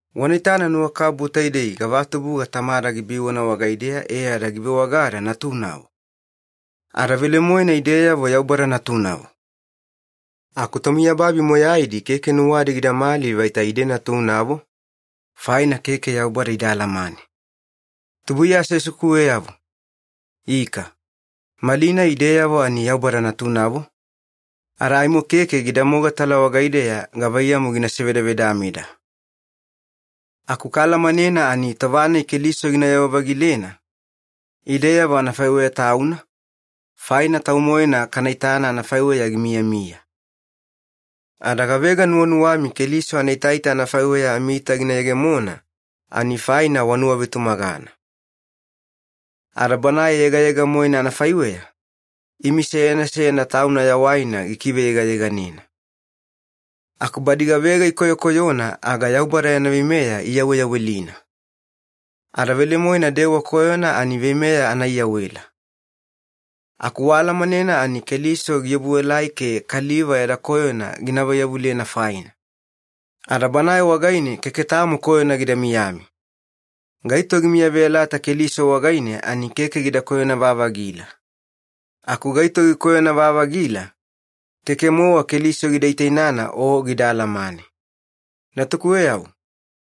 Wana itana nuwakabubu taidei gavatubuga Tamada gibiwana wagaideya e ada givewagada ‘natunavo’! Ada velemoena ideyavo Yaubada natunavo! Aku tomiyababi moyaidi keke nuwadi gidamali vaita ide natunavo, faina keke Yaubada ida alamane. Tubuiya aseasekuweyavo, ika, malinai ideyavo ani Yaubada natunavo, ada aimo keke gida mogatala wagaideya gavaiyamu gina sevedavedameda. Aku kaalamanena ani tova-nai Keliso ginayewa-vagilena, ideyavo anafaiweya Tauna, faina Tau-moena kana itana anafaiweya gimiyamiya. Ada gavega nuwanuwami Keliso anaitaita anafaiweya amiita gina yegemona ani faina wanuwavetumagana. Ada Banae yegayega-moena anafaiweya, imi seyana seyana tauna yawaina gikikiveyegayeganena. Aku badi gavega ikoyokoyona aga Yaubada yana veimeya iyaweyawelina. Ada velemoena dewa koyona ani veimeya anaiyawela. Aku waalamanena ani Keliso giobuelai ke kaliva yada koyona gina vaiyavulena faina. Ada Banae wagaine keke tamo koyona gida miyami. Gaito gimiyaveyalata Keliso wagaine ani keke gida koyona-vavagila. Aku gaito gikoyona-vavagila, keke-mowa Keliso gida itainana o gida alamane. Natukuweyavo,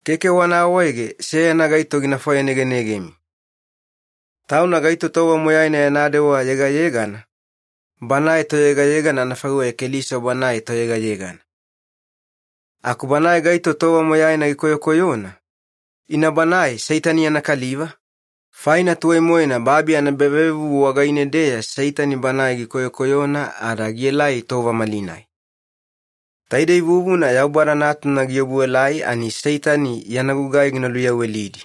keke wana awaege seyana gaito gina fwayanegenegemi. Tauna gaito tova moyaina yana dewa yegayegana, banae toyegayegana anafaiweya Keliso Banae Toyegayegana. Aku banae gaito tova moyaina gikoyokoyona, ina banae Seitani yana kaliva, faina tuwai-moena babi anaebavevuvu wagaine-deya Seitani banae gikoyokoyona ada gielai tova malinai. Taidei vuvuna Yaubada Natuna giobuelai ani Seitani yana gugai gina luyawelidi.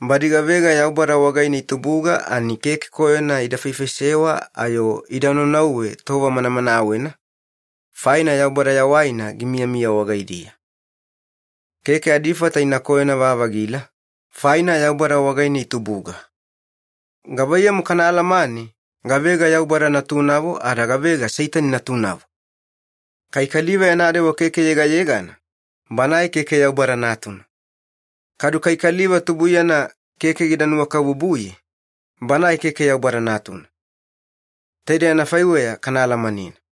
Badi gavega Yaubada wagaine itubuga ani keke koyona ida faifaisewa ayo ida naunauwe tova manamanawena, faina Yaubada yawaina gimiyamiya wagaidiya. Keke adifata ina koyona-vavagila, faina Yaubada wagaine itubuga. Gavaiyamu kana alamane gavega Yaubada natunavo ada gavega Seitani natunavo? Kai kaliva yana dewa keke yegayegana, banae keke Yaubada natuna. Kadu kai kaliva tubuiyana keke gida nuwakabubuye, banae keke Yaubada natuna. Taidei anafaiweya kana alamanena.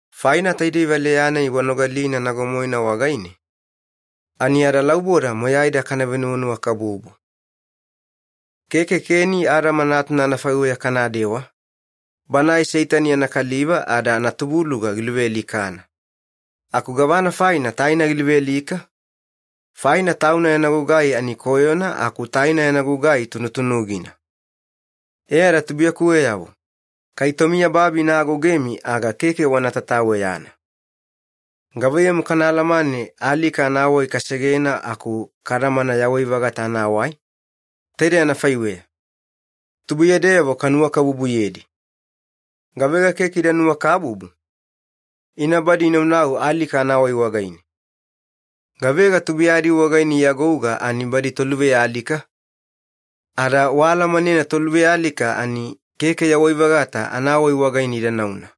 Faina taidei valeya-nai wanogalina nago-moena wagaine, ani adalauboda moyaida kana venuwanuwakabubu. Keke Keni Adama natuna anafaiweya kanadewa, banae Seitani yana kaliva ada anatubuluga giluvealikana. Aku gavana faina taina giluvealika? Faina tauna yana gugai ani koyona aku taina yana gugai tunutunugina. E ada tubuiyakuweyavo, kai tomiyababi ina agougemi aga keke wana tataweyana. Gavaiyamu kana alamane alika anawai kasegena aku kadamana yawai-vagata anawai? Taidei anafaiweya. Tubuiyadeyavo kanuwakabubuyedi. Gavega keke ida nuwakabubu, ina badi inaunau alika anawai wagaine. Gavega tubuiyadi wagaine iagouga ani badi toluvealika, ada waalamanena toluvealika ani keke yawai-vagata anawai wagaine ida nauna.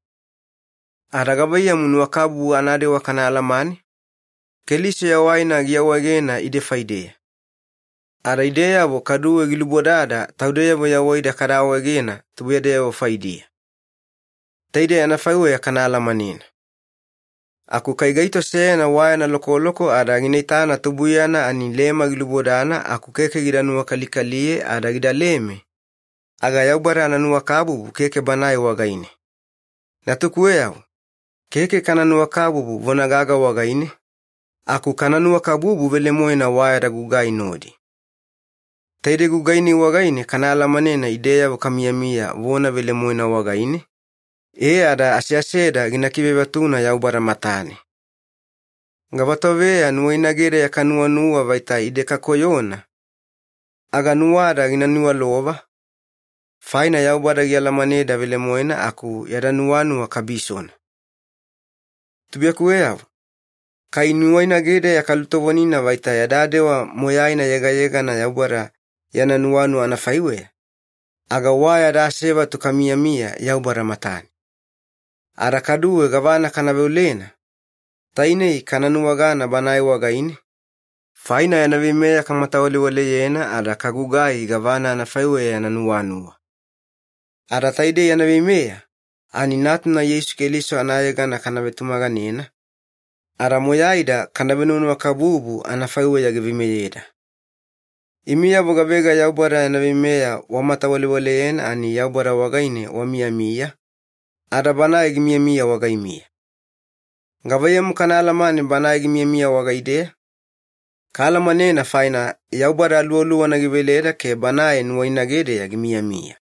Ada gavaiyamu nuwakabubu anadewa kana alamane? Keliso yawaina giawaegena ide faideya. Ada ideyavo kaduwe gilubodada taudeyavo yawaida kada awaegena tubuiyadeyavo faidiya. Taidei anafaiweya kana alamanena. Aku kai gaito seyana wa yana lokoloko ada gina itana tubuiyana ani lema gilubodana aku keke gida nuwakalikaliye ada gidaleme, aga Yaubada ananuwakabubu keke banae wagaine. Natukuweyavo, keke kana nuwakabubu vona gaga wagaine, aku kana nuwakabubu velemoena wa yada gugai nodi. Taidei gugai-nai wagaine kana alamanena ideyavo kamiyamiya vona velemoena wagaine, e ada aseaseda gina kivevatuna Yaubada matane. Gavatoveya nuwainagedeya kanuwanuwa vaita ide kakoyona, aga nuwada gina niwalova, faina Yaubada gialamaneda velemoena aku yada nuwanuwa kabisona. Tubuiyakuweyavo, kai nuwainagedeya kalutovonina vaita yada dewa moyaina yegayegana Yaubada yana nuwanuwa anafaiweya, aga wa yada asevatu kamiyamiya Yaubada matane. Ada kaduwe gavana kana veolena, tainei kana nuwagana Banae wagaine, faina yana veimeya kamatawalewaleyena ada kagugai gavana anafaiweya yana nuwanuwa. Ada taidei yana veimeya, ani Natuna Yeisu Keliso anayegana kana vetumaganena, ada moyaida kana venuwanuwakabubu anafaiweya giveimeyeda. Imiyavo gavega Yaubada yana veimeya wamatawalewaleyena ani Yaubada wagaine wamiyamiya, ada Banae gimiyamiya wagaimiya. Gavaiyamu kana alamane Banae gimiyamiya wagaideya? Kaalamanena faina Yaubada Aluwaluwana giveleda ke Banae nuwainagedeya gimiyamiya.